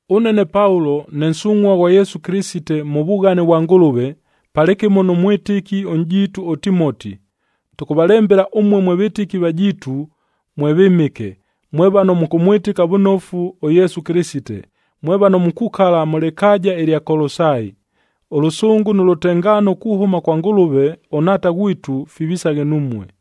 Ʉne ne Paulo, ne nsungʼhua ghwa Yesu Kɨlɨsite mʉ vughane vwa Ngʉlʉve, palɨkɨmo nʉ mwɨtɨki ʉnʼjiitu ʉTimoti, tʉkʉvalembela ʉmue mwe vɨtɨki vajiitu, mwe vɨmɨke, mwe vano mʉkʉmwɨtɨka vʉnofu ʉYesu Kɨlɨsite, mwe vano mukukala mʉ lɨkaaja ɨlya Kolosai. Ʉlʉsʉngʉ nʉ lʉtengaano kuhʉma kwa Ngʉlʉve ʉNhaata ghwitu, fivisaghe numue.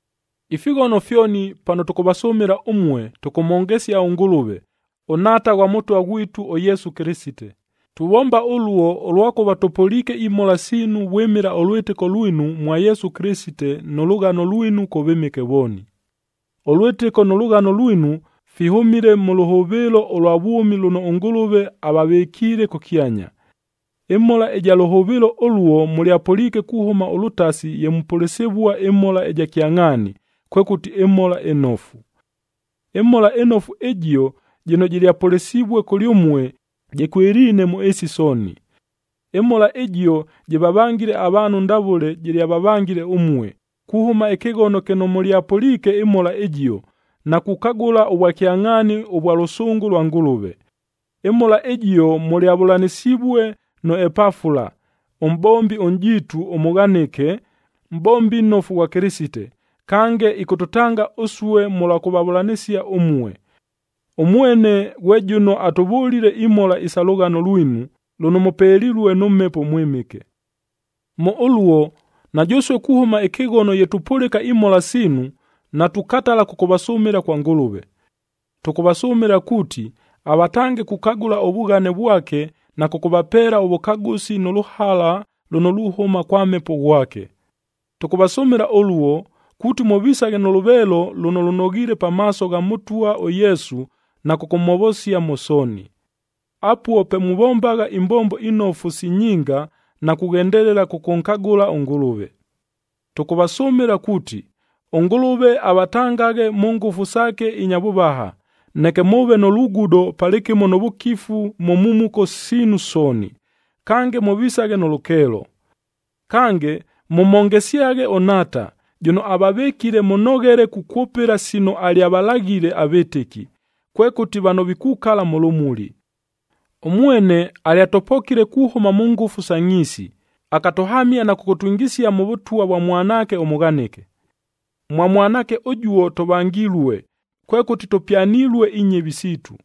Ifighono fyoni pano tʉkʉvasʉmɨla ʉmue, tʉkʉmhongesia ʉNgʉlʉve, ʉNhaata ghwa Mʉtwa ghwitu ʉYesu Kɨlɨsite. Tuvomba ʉluo, ʉlwakʉva tʉpʉliike imhola siinu vwɨmɨla ʉlwɨtɨko lwinu mwa Yesu Kɨlɨsite nʉ lʉghano lwinu kʉ vɨmɨke vooni. Ʉlwɨtɨko nʉ lʉghano lwinu fihʉmile mʉ lʉhʉvɨɨlo ʉlwa vwʉmi lʉno ʉNgʉlʉve avavɨkiile kʉkyanya. Ɨmhola ɨja lʉhʉvɨɨlo ʉluo mʉlyapʉliike kuhʉma ʉlʉtasi ye mupʉlɨsɨvua ɨmhola ɨja kyangʼhaani, kwekʉti ɨMhola ɨNofu. ƗMhola ɨNofu ɨjio, jɨno jɨlyapʉlɨsivue kʉlyʉmue, jɨkwɨliine mʉ ɨɨsi sooni. ƗMhola ɨjio jɨvavangile avaanhu ndavʉle jɨlyavavangile ʉmue, kuhʉma ɨkɨghono kɨno mʉlyapʉliike ɨMhola ɨjio, na kukagʉla ʉvwakyangʼhaani ʉvwa lʉsʉngʉ lwa Ngʉlʉve. ƗMhola ɨjio mʉlyavʉlanɨsivue nʉ Epafula, ʉmʼbombi ʉnʼjiitu ʉmʉghanɨke, mʼbombi nnofu ghwa Kɨlɨsite, kange ɨkʉtʉtanga ʉsue mʉlwa kʉvavʉlanɨsia ʉmue. Ʉmwene ghwe jʉno atʉvʉlile imhola isa lʉghano lwinu, lʉno mʉpelilue nʉ Mhepo ʉMwɨmɨke. Mʉ ʉluo, na jʉsue kuhʉma ɨkɨghono ye tupʉlɨka imhola siinu, natukatala kʉkʉvasʉmɨla kwa Ngʉlʉve. Tʉkʉvasʉmɨla kuuti, avatange kukagʉla ʉvughane vwake na kʉkʉvapeela ʉvʉkagʉsi nʉ lʉhala lʉno luhʉma kwa Mhepo ghwake. Tʉkʉvasʉmɨla ʉluo, kuuti mʉvisaghe nʉ lʉveelo lʉno lʉnoghiile pamaaso gha Mʉtwa ʉYesu na kʉkʉmhovosia mʉ sooni. Apuo pe muvombagha imbombo inofu si nyinga na kughendelela kʉkʉnkagʉla ʉNgʉlʉve. Tʉkʉvasʉmɨla kuuti, ʉNgʉlʉve avatangaghe mʉ ngʉfu saake inya vʉvaha, neke mʉʉve nʉ lugudo palɨkɨmo nʉ vʉkifu mʉ mhumuko siinu sooni, kange mʉvisaghe nʉ lʉkeelo. Kange, mʉmhongesyaghe ʉNhaata, jʉno avavɨkile mʉnoghele kukwʉpɨla sino alyavalaghile avɨtɨki, kwekʉti vano vikukala mʉ lʉmuli. Ʉmwene alyatʉpokile kuhʉma mʉ ngʉfu sa ngʼhiisi, akatʉhamia na kʉkʉtwingisia mʉ Vʉtwa vwa Mwanaake ʉmʉghanɨke. Mwa Mwanaake ʉjuo, tʉvangilue, kwekʉti tʉpyanilue inyɨvi siitu.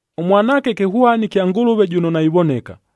ɄMwanaake kɨhwani kya Ngʉlʉve jʉno naivoneka,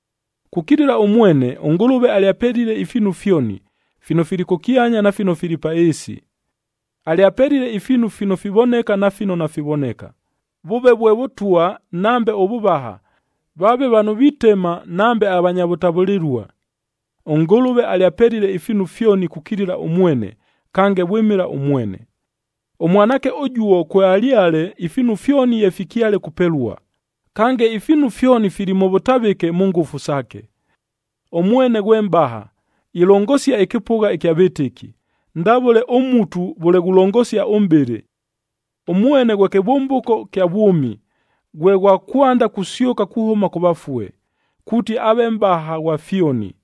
Kukilila ʉmwene, ʉNgʉlʉve alyapelile ifiinu fyoni, fino fili kʉkyanya na fino fili pa ɨɨsi. Alyapelile ifiinu fino fivoneka na fino nafivoneka, vʉʉve vwe vʉtwa nambe ʉvʉvaha, vaave vano vitema nambe avanya vʉtavʉlɨlua. ɄNgʉlʉve alyapelile ifiinu fyoni kukilila ʉmwene, kange vwɨmɨla ʉmwene. ɄMwanaake ʉjuo kwealyale ifiinu fyoni ye fikyale kupelua, kange ifiinu fyoni fili mʉ vʉtavɨke mʉ ngʉfu saake. Ʉmwene ghwe mʼbaha, ilongosia ɨkɨpʉgha ɨkya vɨtɨki, ndavʉle ʉmutu vʉle ghulongosia ʉmʼbɨlɨ. Ʉmwene ghwe kɨvʉmbʉko kya vwʉmi, ghwe ghwa kwanda kusyʉka kuhʉma kʉ vafue, kuuti aave mʼbaha ghwa fyoni.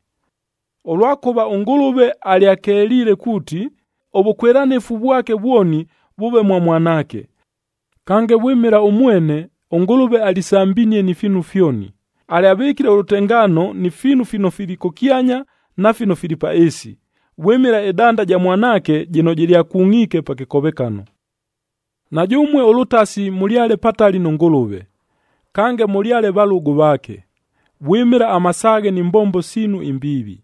Ʉlwakʉva ʉNgʉlʉve alyakeliile kuuti, ʉvʉkwɨlanɨfu vwake vwoni vʉʉve mwa Mwanaake. Kange, vwɨmɨla ʉmwene, ʉNgʉlʉve alisambinie ni fiinu fyoni, alyavɨkile ʉlʉtengaano ni fiinu fino fili kʉkyanya na fino fili pa ɨɨsi, vwɨmɨla ɨdanda ɨja Mwanaake jɨno jɨlyakungʼiike pa kɨkovekano. Na jʉmue ʉlʉtasi mʉlyale patali nʉ Ngʉlʉve, kange mʉlyale valʉgʉ vaake, vwɨmɨla amasaaghe ni mbombo siinu imbiivi.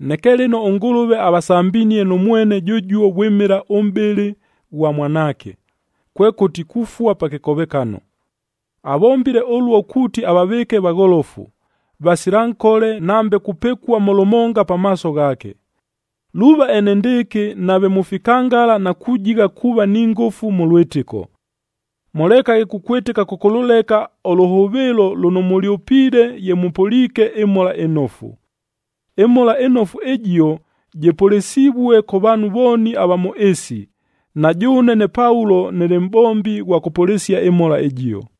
Neke lɨno ʉNgʉlʉve avasambinie nʉ mwene jʉjuo vwɨmɨla ʉmʼbɨlɨ ʉghwa Mwanaake, kwekʉti kufua pa kɨkovekano. Avombile ʉluo kuuti avavɨɨke vagholofu, vasila nkole nambe kupɨkua mʉ lʉmonga pamaaso ghaake. Luuva enendɨɨkɨ nave mufikangala na kujigha kuuva ni ngʉfu mʉ lwɨtɨko. Mʉlekaghe kukwɨtɨka kʉkʉlʉleka ʉlʉhʉvɨɨlo lʉno mʉlyʉpiile ye mʉpʉliike ɨMhola ɨNofu. ƗMhola ɨNofu ɨjio, jɨpʉlɨsivue kʉ vaanhu vooni ava mʉ ɨɨsi, na jʉʉne ne Paulo nɨlɨ mʼbombi ghwa kʉpʉlɨsia ɨMhola ɨjio.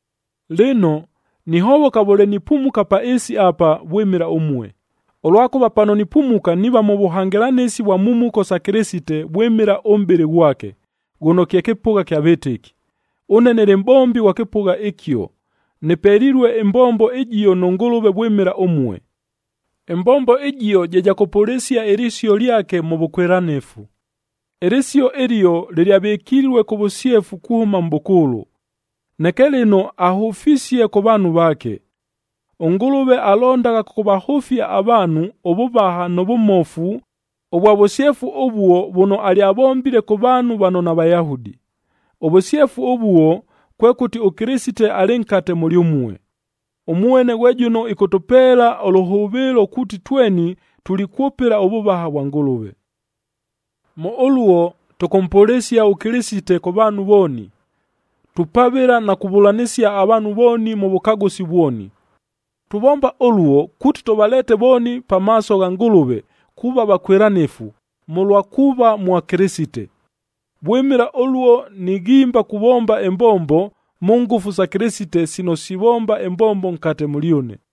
Lɨno, nihovoka vʉle nipumuka pa ɨɨsi apa vwɨmɨla ʉmue, ʉlwakʉva pano nipumuka niiva mʉ vʉhangɨlanɨsi vwa mhumuko sa Kɨlɨsite vwɨmɨla ʉmʼbɨlɨ ghwake, ghʉno kye kɨpʉgha kya vɨtɨki. Ʉne nɨlɨ mʼbombi ghwa kɨpʉgha ɨkio, nɨpelilue ɨmbombo ɨjio nʉ Ngʉlʉve vwɨmɨla ʉmue. Ɨmbombo ɨjio je ja kʉpʉlɨsia ɨlɨsio lyake mʉ vʉkwɨlanɨfu. Ɨlɨsio ɨlio, lɨlyavɨkilue kʉ vʉsyefu kuhʉma mʼbʉkʉʉlʉ. Neke lɨno ahʉfisie kʉ vaanhu vaake. ɄNgʉlʉve alondagha kʉkʉvahʉfia avaanhu ʉvʉvaha nʉ vʉmofu ʉvwa vʉsyefu ʉvuo vʉno alyavombile kʉ vaanhu vano naVayahudi. Ʉvʉsyefu ʉvuo, kwekʉti ʉKɨlɨsite alɨ nkate mʉlyʉmue. Ʉmwene ghwe jʉno ɨkʉtʉpeela ʉlʉhʉvɨɨlo kuuti tweni tulikwʉpɨla ʉvʉvaha vwa Ngʉlʉve. Mʉ ʉluo, tʉkʉmpʉlɨsia ʉKɨlɨsite kʉ vaanhu vooni, tupavɨla na kuvʉlanɨsia avaanhu vooni mʉ vʉkagʉsi vwoni. Tuvomba ʉluo, kuuti tʉvaleete vooni pamaaso gha Ngʉlʉve kuuva vakwɨlanɨfu mʉlwa kuuva mwa Kɨlɨsite. Vwɨmɨla ʉluo nighimba kuvomba ɨmbombo mʉ ngʉfu sa Kɨlɨsite sino sivomba ɨmbombo nkate mʉlyʉne.